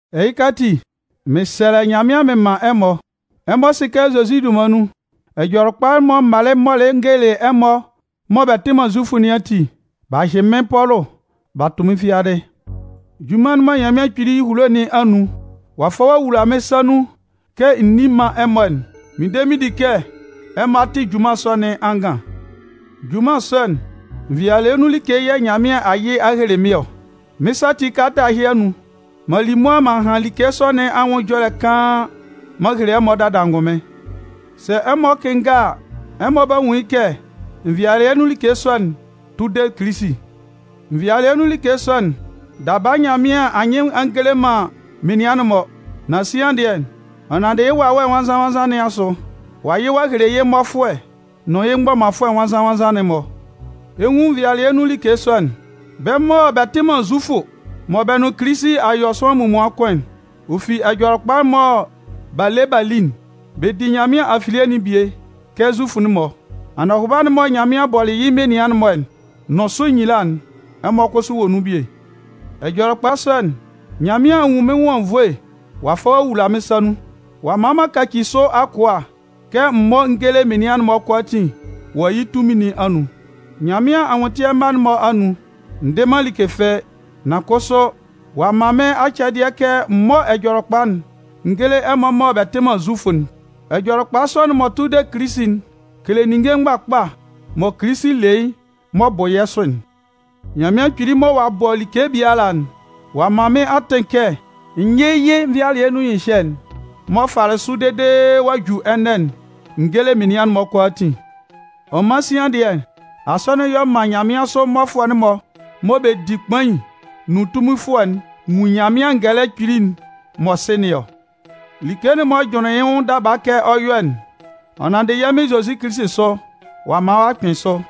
Ɛhɩka ati, mɩn sɛlɛ Nyanmɩan mɩn man ɛmɔ. Ɛmɔ sɩ kɛ Zozi dunman nun, Ɛjɔlɛkpa'n mɔ m malɩ m mɔlɩ n gelelɩ ɛmɔ mɔ bɛ tɩ man Zufʋ nɩn ati, b'a hyɩ mɩ́n Pɔlʋ b'a tʋ mɩ́n fiadɩ. Junman'n mɔ Nyanmɩan Kpili ehulo nɩn anun ɔ'a fa ɔ'a wula mɩ́n sa nun kɛ n ní man ɛmɔ'n, mɩn de mɩn di kɛ ɛmɔ a tɩ junman sɔ nɩn angan. Junman sɔ'n, nvɩalɩɛ nun like yɛ̂ Nyanmɩan a yɩ ɔ'a hele mɩ́n ɔ. Mɩ́n sa ati kalata ɛhɩ anun, m'an li mʋa m'an han like sɔ nɩn anwʋn ɛjɔlɛ kaan m'an hele ɛmɔ dada angʋnmɩn. Sɛ ɛmɔ kɩnnga a, ɛmɔ 'ba nwun yɩ́ kɛ nvɩalɩɛ nun like sɔ'n tʋ de Kilisi. Nvɩalɩɛ nun like sɔ'n, daba Nyanmɩan a nyɩ man ɔ'a ngele man menian'n-mɔ. Nan sian dɩɛ, ɔ nanndɩ yɩ́ Wawɛ Nwannzan-nwannzan nɩn asʋ, ɔ'a yɩ ɔ'a hele yɩ́ mmɔfʋɛ nʋn yɩ́ mgbɔmanfʋɛ nwannzan-nwannzan'n-mɔ. Ɛ 'nwun nvɩalɩɛ nun like sɔ'n: bɛ́ mɔ bɛ tɩ man Zufʋ mɔ bɛ nʋn Kilisi a yɔ sʋanlan munmuan kʋn, ɔ fi Ɛjɔlɛkpa'n mɔ b'a le b'a li'n, bɛ di Nyanmɩan afilie'n bie kɛ Zufʋ'n-mɔ. Anɔhʋba'n mɔ Nyanmɩan bɔlɩ yɩ́ menian'n-mɔ nʋn sʋ nyila'n, ɛmɔ kʋsʋ wɔ nun bie. Ɛjɔlɛkpa sɔ'n, Nyanmɩan a nwun mɩ́n nwʋn anwunnvoe ɔ'a fa ɔ'a wula mɩ́n sa nun. Ɔ'a man m'an kaci sʋ akʋa kɛ m mɔ́ n géle menian'n-mɔ kʋalaatin wɔ yɩ́ tunmin nɩn anun. Nyanmɩan anwʋntɩɛ mma'n-mɔ anun, n dɩ man like fɩ́ɩ́. Nan kʋsʋ, ɔ'a man mɩ́n acɛdɩɛ kɛ m mɔ́ Ɛjɔlɛkpa'n n géle ɛmɔ mɔ bɛ tɩ man Zufʋ'n. Ɛjɔlɛkpa sɔ'n m'ɔ tʋ de Kilisi'n kele ninnge mgbakpa mɔ Kilisi le yɩ́ m'ɔ bʋ yɛ́ sʋ'n. Nyanmɩan Kpili mɔ ɔ'a bɔ like biala'n, ɔ'a man mɩ́n atɩn kɛ n yɩ́ yɩ́ nvɩalɩɛ nun ɛhyɩhyɛ'n m'ɔ fɩalɩ sʋ dede ɔ'a ju ɛnɛ'n n géle menian'n-mɔ kʋalaatin. Ɔ man sian dɩɛ, Asɔnɩn'n y'ɔ man nyanmɩansʋ mmɔfʋɛ'n-mɔ mɔ bɛ di kpain nʋn tunminfʋɛ'n nwun Nyanmɩan ngɛlɛ kpili'n m'ɔ sɩ nɩn ɔ. Like'n m'ɔ jʋnlɩnlɩn yɩ́ nwʋn daba kɛ ɔ 'yɔ'n, ɔ nanndɩ yɛ́ Mɩn Zozi Kilisi sʋ, ɔ'a man ɔ'a kpɩn sʋ.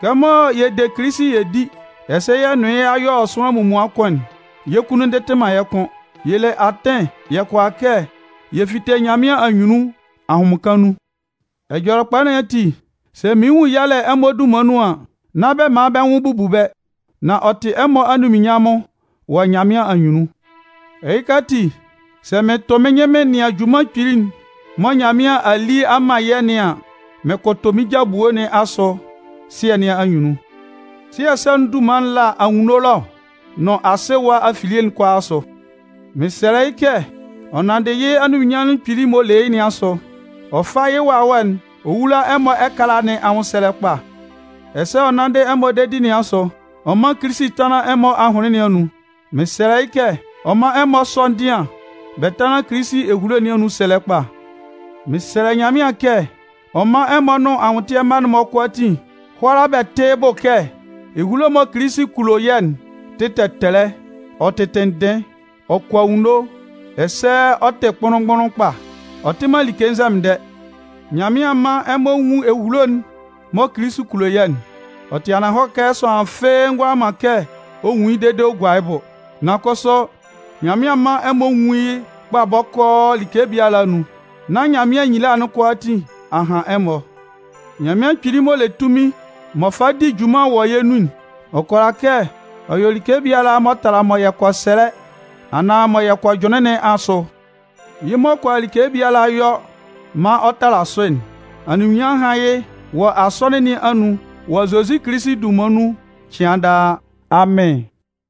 Kɛmɔ yɛ de Kilisi yɛ di, ɛsɛ yɛ nʋn yɩ́ y'a yɔ sʋanlan munmuan kʋn'n, yɛ́ kunnun ndɩtɩ man yɛ́ kʋ́n. Yɛ le atɩn yɛ kʋala kɛ yɛ fite Nyanmɩan anyunnun ahʋnmɩnkan nun. Ɛjɔlɛkpa nɩn ati, sɛ mɩɩn nwun yalɛ ɛmɔ dunman nun an, nán bɛ man bɛ́ nwʋn bubu bɛ́. Nan ɔ tɩ ɛmɔ anunminnyanmʋn wɔ Nyanmɩan anyunnun. Ɛhɩka ati, sɛ mɩn tʋ mɩ́n nyɩn mɩn nɩan junman kpili'n mɔ Nyanmɩan a li a man yɛ́ nɩn an, mɩn kʋtʋ mɩ́n ja ebue nɩn asʋ Sɩɛ nɩn anyunnun. Sɩɛ sɔ'n dunman'n la anwunno ɛlɔ nʋn asɩ ɛwa afilie kʋalaa asʋ. Mɩn sɛlɛ yɩ́ kɛ, ɔ nanndɩ yɩ́ anunminnyanmʋn kpili'n m'ɔ le yɩ́ nɩn asʋ, ɔ fá yɩ́ Wawɛ'n ɔ wúla ɛmɔ ɛkala nɩn anwʋnsɛlɛ kpa. Ɛsɛ, ɔ nanndɩ ɛmɔ dedi nɩn asʋ, ɔ mán Kilisi tánlan ɛmɔ ahʋnlɩn nɩn anun. Mɩn sɛlɛ yɩ́ kɛ ɔ mán ɛmɔ sɔ́ ndɩan bɛ tánlan Kilisi ehulo nɩn anun sɛlɛ kpa. Mɩn sɛlɛ Nyanmɩan kɛ ɔ mán ɛmɔ nʋn anwʋntɩɛ mma'n-mɔ kʋalaatin hʋ́ala bɛ tɩ́ yɩ́ bʋ kɛ ehulo'n mɔ Kilisi kulo yɛ́'n tɩ tɛtɛlɛ, ɔ tɩ tɩnndɩn, ɔ kɔ anwunno ɛsɛ ɔ tɩ kpʋnlʋn-mgbʋnlʋn kpa. Ɔ tɩ man like nzɛmɩndɛ. Nyanmɩan mán ɛmɔ nwún ehulo'n mɔ Kilisi kulo yɛ́'n. Ɔ tɩ ananhɔlɛ kɛ sʋanlan fɩ́ɩ́ ngʋala man kɛ ɔ nwun yɩ́ dede ɔ gua yɩ́ bʋ. Nan kʋsʋ, Nyanmɩan mán ɛmɔ nwún yɩ́ kpa bɔkɔɔ like biala anun, nán Nyanmɩan nyila'n kʋalaatin a han ɛmɔ. Nyanmɩan Kpili m'ɔ le tunmin m'ɔ fa di junman wɔ yɛ́ nun'n, ɔ kʋala kɛ ɔ yɔ like biala m'ɔ tala mɔ yɛ kɔ sɛlɛ anaan mɔ yɛ kɔ jʋnlɩn nɩn asʋ. Yɩ́ m'ɔ kʋala like biala yɔ maan ɔ tala sʋ'n, anunminnyanmʋn hán yɩ́ wɔ Asɔnɩn nɩn anun wɔ Zozi Kilisi dunman nun cɩan daa! Amɩn.